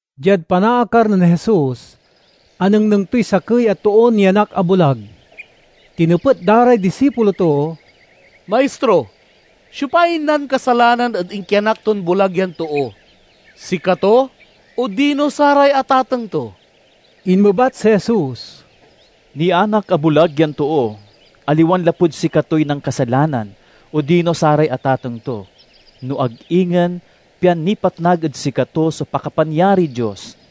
Diad panaakar nen Jesus, anengneng toy sakey a toon nianak a bulag. Tinepet da ray disipulo to, "Maistro, siopay nankasalanan ed inkianak ton bulag yan too, sikato odino saray atateng to?" Inmebat si Jesus, "Nianak a bulag yan too, aliwan lapud sikatoy nankasalanan odino saray atateng to, no ag ingen pian nipatnag ed sikato so pakapanyariy Dios.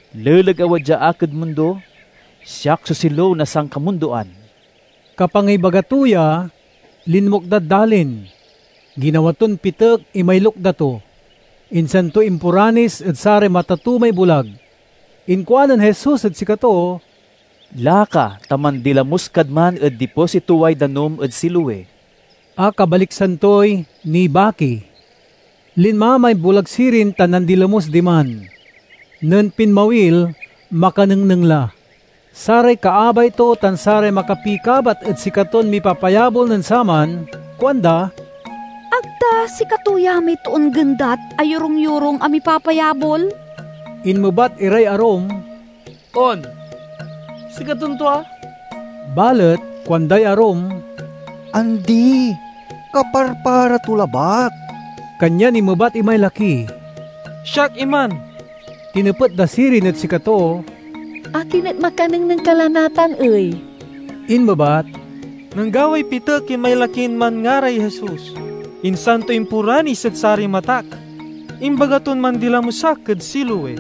Leleg a wadya ak ed mundo, siak so silew na sankamundoan." Kapangibaga to ya, linmukdad dalin. Ginawa ton pitek imay lukda to, insan to imporanis ed saray mata to may bulag. Inkuanen Jesus ed sikato, "Laka, ta mandilamus kad man ed dipositoway danum ed Siloe" (a kabaliksan toy "Nibaki"). Linma may bulag sirin tan nandilamus diman. Nen pinmawil makanengneng la. Saray kaabay to tan saray makapikabat ed sikaton mipapayabol nen saman kuanda, "Ag ta sikato ya may toon gendat a yorung-yorung a mipapayabol?" Inmebat iray arum, "On, sikaton tua." Balet kuanday arum, "Andi, kaparpara to labat." Kanyan inmebat imay laki, "Siak iman." Tinepet da sirin ed sikato, "Akin et makanengneng ka la natan ey?" Inmebat, "Nanggaway pitek imay lakin manngaray Jesus, insan to imporanis ed saray matak. Imbaga ton mandilamus ak ed Siloe.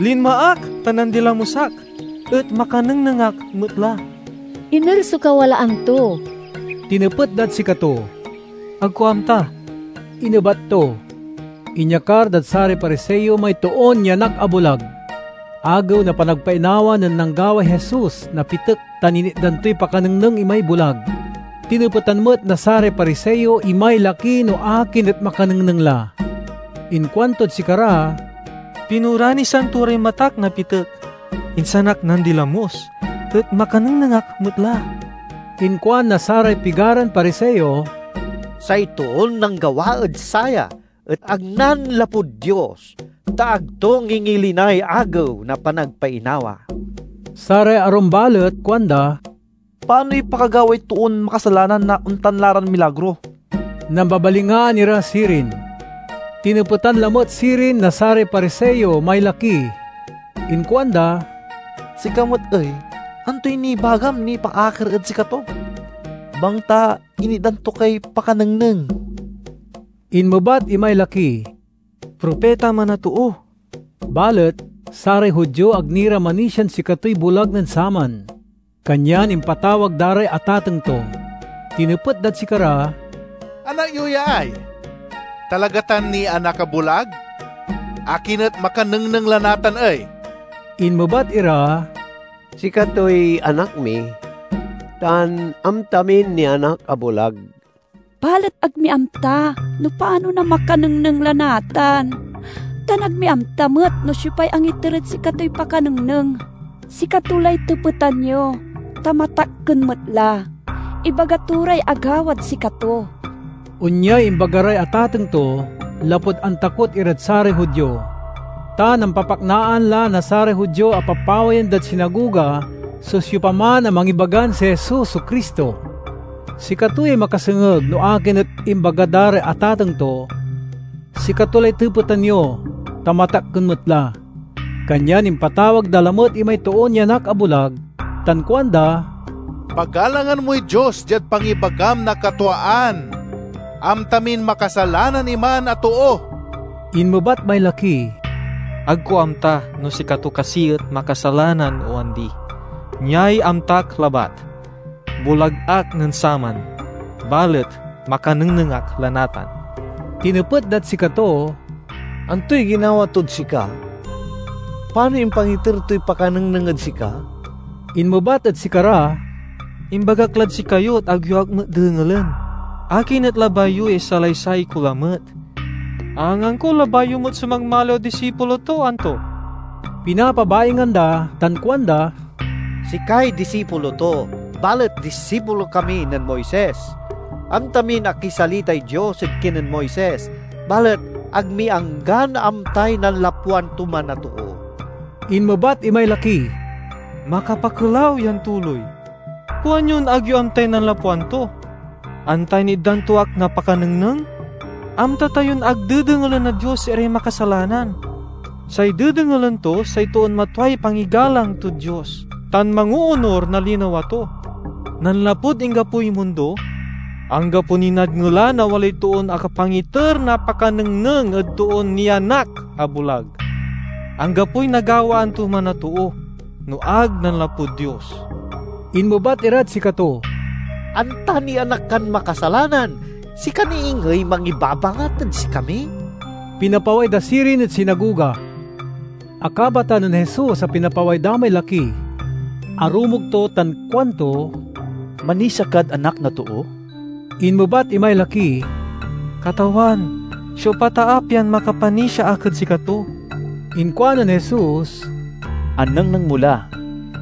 Linma ak tan nandilamus ak, et makanengneng ak met la!" "Iner so kawalaan to?" tinepet dad sikato. "Ag ko amta," inebat to. Inyakar dad saray Pariseo may toon nianak a bulag. Agew na Panagpainawa nen nanggaway Jesus na pitek tan initdan toy pakanengneng imay bulag. Tinepetan met na saray Pariseo imay laki no akin et makanengneng la. Inkuantod sikara, "Pinoranisan to ray matak na pitek, insan ak nandilamus, et makanengneng ak met la!" Inkuan na saray pigaran Pariseo, "Say toon nanggawa ed saya et ag nanlapud Dios, ta ag to ngingilinay Agew na Panagpainawa." Saray arum balet kuanda, "Panoy pakagaway toon makasalanan na ontan la ran milagro?" Nambabalingaan ira sirin. Tinepetan lamet sirin na saray Pariseo may laki. Inkuanda, "Sika met ey, antoy nibagam nipaakar ed sikato, bangta initdan to kay pakanengneng?" Inmebat imay laki, "Propita man a too." Balet saray Judio ag ni ra manisian sikatoy bulag nen saman, kanyan impatawag da ray atateng to. Tinepet dad sikara, "Anak yo ya ay? Talaga tan nianak a bulag? Akin et makanengneng la natan ey?" Inmebat ira, "Sikatoy anak mi, tan amta min nianak a bulag. Balet ag mi amta no panon a makanengneng la natan, tan ag mi amta met no siopay angiter ed sikatoy pakanengneng. Sikato lay tepetan yo, ta matakken met la! Ibaga to ray agawad sikato." Onyay imbaga ray atateng to, lapud antakot irad saray Judio. Ta nampapaknaan la na saray Judio a papawayen dad sinagoga so siopaman a mangibagan si Jesus so Cristo. Sikato yay makasengeg no akin et imbaga da ray atateng to, "Sikato lay tepetan yo, ta matakken met la!" Kanyan impatawag da lamet imay toon nianak a bulag tan kuanda, "Pagalangan moy Dios diad pangibagam na katwaan! Amta min makasalanan iman a too." Inmebat may laki, "Ag ko amta no sikato kasi et makasalanan o andi. Niay amtak labat: bulag ak nen saman, balet makanengneng ak la natan." Tinepet dad sikato, "Antoy ginawa tod sika? Panoy impangiter toy pakanengneng ed sika?" Inmebat ed sikara, "Imbagak lad sikayo et ag yo ak met dengelen. Akin et labay yo ya isalaysay ko lamet? Angangko labay yo met so magmaliw a disipulo to, anto?" Pinapabaingan da tan kuanda, "Sikay disipulo to, balet disipulo kami nen Moises. Amta min akisalitay Dios ed kinen Moises, balet ag mi anggan amtay nanlapwan to man a too!" Inmebat imay laki, "Makapakelaw yan tuloy! Kuanyon ag yo amtay nanlapwan to, anta initdan to ak na pakanengneng! Amta tayon ag dedengelen na Dios iray makasalanan. Say dedengelen to say toon matway pangigalang tod Dios tan mangoonur na linawa to. Nanlapud inggapoy mundo, anggapo niy nadngelan a walay toon akapangiter na pakanengneng ed toon nianak a bulag. Anggapoy nagawaan to man a too no ag nanlapud Dios." Inmebat irad sikato, "Anta nianak kan makasalanan, sika ni ingey mangibabangat ed sikami?" Pinapaway da sirin ed sinagoga. Akabatan nen Jesus a pinapaway da may laki. Arumog to tan kuanto, "Manisia kad Anak na Too?" Inmebat imay laki, "Katawan, siopa ta a pian makapanisia ak ed sikato?" Inkuanen Jesus, "Anengneng mo la.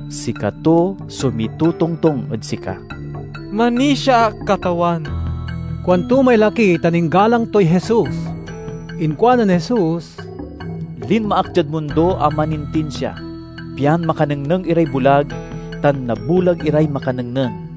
Sikato so mitotongtong ed sika." "Manisia ak, Katawan!" kuanto may laki tan inggalang toy Jesus. Inkuanen Jesus, "Linma ak diad mundo a manintinsia, pian makanengneng iray bulag tan nabulag iray makanengneng."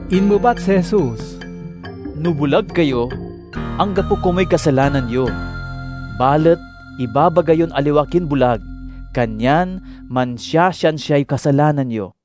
Inmebat si Jesus, "No bulag kayo, anggapo komuy kasalanan yo. Balet ibabaga yon aliwa kin bulag, kanyan mansiasiansiay kasalanan yo."